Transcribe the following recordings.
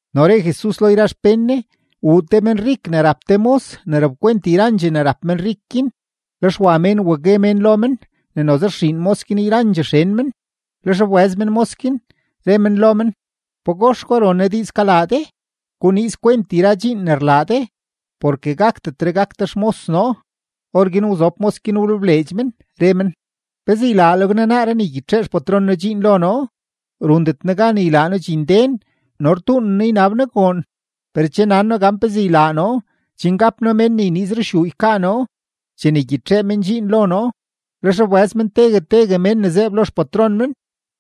No re Jesus lo yra xpén Ne: ―Wuu te menrik ne rap te mos ne rapkwent yrandxee ne rap menrik guin, lex wa mén wa gue mén lo men ne noze rxiin mos guin yrandxee xen men. Lex wbëz men mos guin, re men lo men: “¿Pagox gwa ron noo diiz kalaa de? Guniiz kwent yra dxiin ne rlaa de, porke gakdetre gak de xmos noo.” Orguin wzob mos guin wlebleedx men, re men: “¿Pezee ylaaleg noo naaree ne ygyitxee xpatron noo dxiin lo noo? Rundet noo gan ylaa noo dxinden no rtuunen noo ynab noo goon. Per che nan noo gan pezee ylaa noo chen gap noo mén ne yniiz ruxyuu ykaa noo chene ygyitxee men dxiin lo noo.” Lex wbëz men tegue tegue mén ne zeeb lo xpatron men.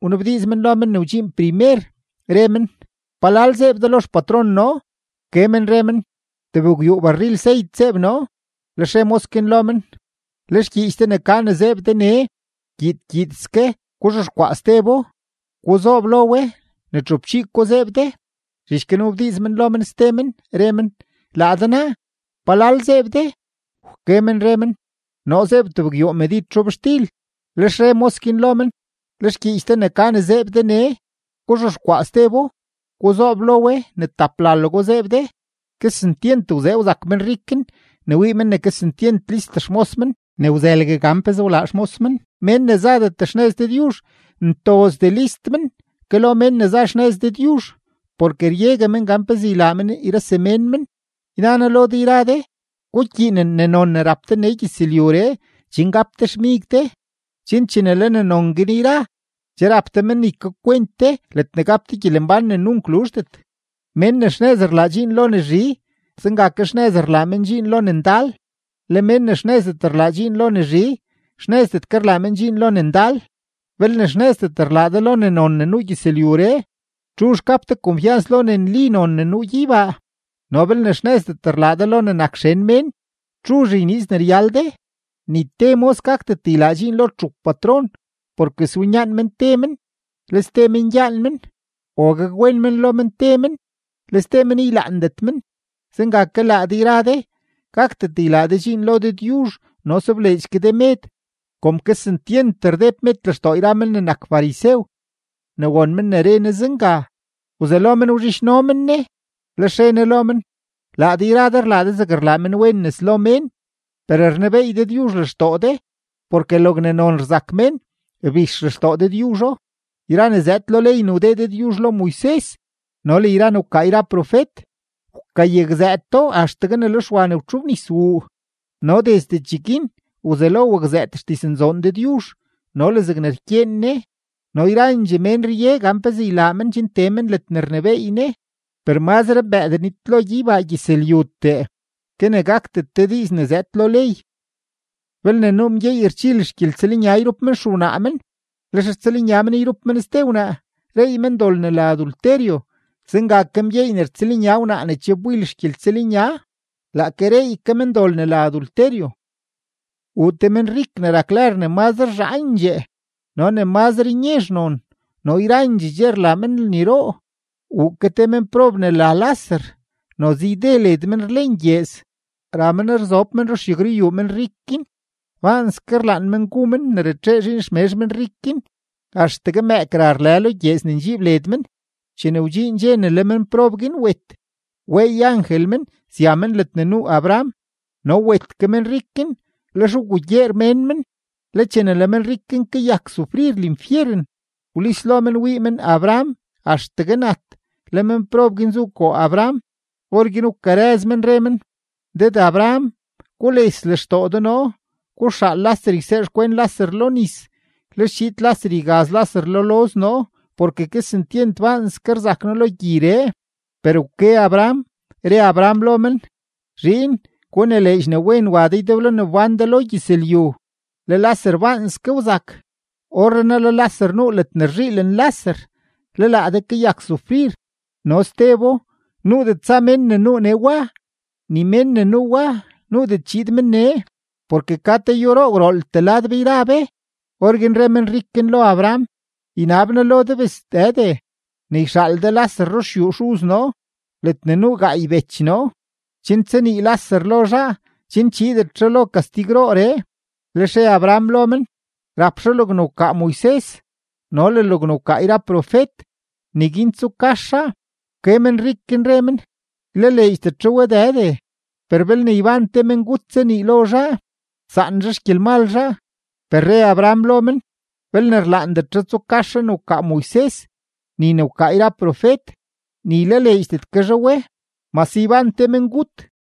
Wnabdiiz men lo men ne wdxiin primer, re men: “¿Palal zeeb de lo xpatron noo?” Wke men re men: “Tebgwyuu barril seyt zeeb noo.” Lex re mos guin lo men: “Le xgyiich de ne ka ne zeeb de nee, gyiid gyiidske guzhexkwaa stebo; guzoob lo we ne txupchii ko zeeb de.” Zhich guin wnabdiiz men lo men ste men, re men: “Laa de naa, ¿palal zeeb de?” Wke men re men: “Noo zeeb tebgwyuu medid zhobxtil.” Lex re mos guin lo men: “Le xgyiich de ne ka ne zeeb de nee, guzhexkwaa stebo; guzoob lo we ne taplalego zeeb de.” Kesentyent wzee wzak menrik guin ne wii men ne kesentyent list xmos men ne wzëlgue gan pezee wlaa xmos men. Mén ne zadet xnëz Dëdyuzh ntozdee list men ke lo mén ne za xnëz Dëdyuzh porke ryegue men gan pezee ylaa men yra semén men. ’Yna noo lo de yra de, gukyiinen ne non ne rap de nee gyëzlyuree chen gap de xmig de, chen chene le ne non guin yra, che rap de men ne ykakwent de ledne gap de gyelembán ne nunk luzhdet. ’Mén ne xnëz rlaa dxiin lo ne zhi, zenga ke xnëz rlaa men dxiin lo ne ndal. Le mén ne xnëzdet rlaa dxiin lo ne zhi, xnëzdet ke rlaa men dxiin lo ne ndal. Belne xnëzdet rlaa de lo ne non ne nuu gyëzlyuree, ¿txuzh gap de konfyans lo ne nli non ne nuu gyeybaa? No belne xnëzdet rlaa de lo ne nak xen mén, ¿txuzh yniiz ne ryal de? ’Ni te mos gakdet ylaa dxiin lo txup patron, porke swinyaan men te men, le ste men gyaan men, o gakwen men lo men te men, le ste men ylaandet men. Zenga ke laa de yra de, gakdet ylaa de dxiin lo Dëdyuzh no sobleedx ke de med. Kom kesentyent rdeb med lextoo yra men ne nak farisew, ne won men ne re Ne zenga, wzelo men wzhidxno men Ne. Lex re Ne lo men: ―Laa de yra de rlaa de zeg rlaa menwen nes lo mén. Per rnebeey Dëdyuzh lextoo de; porke logne non rzak mén, rbix lextoo Dëdyuzho. ’Yra ne zëëd lo ley ne wdee Dëdyuzh lo Moises no le yra ne wkaa yra profet, wkayakzëëto axtegue ne le Xwa ne rtxobnis wuu. No desde cheguin wzelo wakzëët xdiznzoon Dëdyuzh no le zegne rkyeen Ne, no yrandxee mén rye gan pezee ylaa men chen tee men ledne rnebééy Ne. ’Per mazre mbëëdee nitlo gyeybaa gyëzlyutee ke ne gakdet te diiz ne zëëd lo ley. ’Belne nuu mgyeey rchil xgyeltsëlnya yrup men xewnaa men, lex rtsëlnya men yrup men ste wnaa, reey men dol ne la adulterio. Zenga ke mgyeey ne rtsëlnya wnaa ne che wbil xgyeltsëlnya, laake reey ke men dol ne la adulterio. ’Wuu te menrik ne rak lër ne mazre zhaandxee no ne mazre nyezh non, no yzaandxee dxe rlaa men lniroo. Wuu ke te menprob ne la Laser, noze yde led men rlen gyeez; ra men rzob men ruxyagruyuu menrik guin. Baanske rlaan men gu men ne ratxee zhiin xmezh menrik guin; axtegue mëëk ra rlë lo gyeez ne ndxiib led men. Chene wdxiin dxe ne le menprob guin wet, weey angel men sya men ledne nuu Abraham. No wet ke menrik guin, lex wgugyeer mén men. Le chene le menrik guin kayak sufrir linfyeren, wlis lo men wii men Abraham axtegue nat, le menprob guin zu koo Abraham. Orguin wkarëz men, re men: “Dëd Abraham, gules lextoo de noo; guxaal Laser ysee xkwen Laser lo nis, lex chiid Laser ygaz Laser lo loz noo, porke kesentyent baanske rzak noo lo gyiree.” Per wke Abraham, re Abraham lo men: “Zhiin, gunileedx ne wen wa de ydeblo ne wbán de lo gyëzlyu, le Laser baanske wzak. Orrenaa le Laser nuu ledne rzhiilen Laser, le laa de kayak sufrir. No stebo, nuudet tsa mén ne nuu nee wa; ni mén ne nuu wa, nuudet chiid men nee, porke ka te yúroo gwrooltee lad be yra be.” Orguin re menrik guin lo Abraham: “Ynab noo lo de bes Dëde, ne yxaal de Laser ruxyuu xuz noo, ledne nuu gaay bech noo, chen tsanii Laser lo zhaa, chen chiidet zhaa lo kastigrooree.” Lex re Abraham lo men: “Rap zhaa logne wkaa Moises no le logne wkaa yra profet; neguin tsukas zhaa.” Wke menrik guin, re men: “Ylaleedxdet zhaa we Dëde, per belne yban te mengut tsanii lo zhaa, saan zhaa xgyelmal zhaa.” Per re Abraham lo men: “Belne rlaandet zhaa tsukas zhaa ne wkaa Moises ni ne wkaa yra profet, ni ylaleedxdet ke zhaa we, mase yban te mengut.”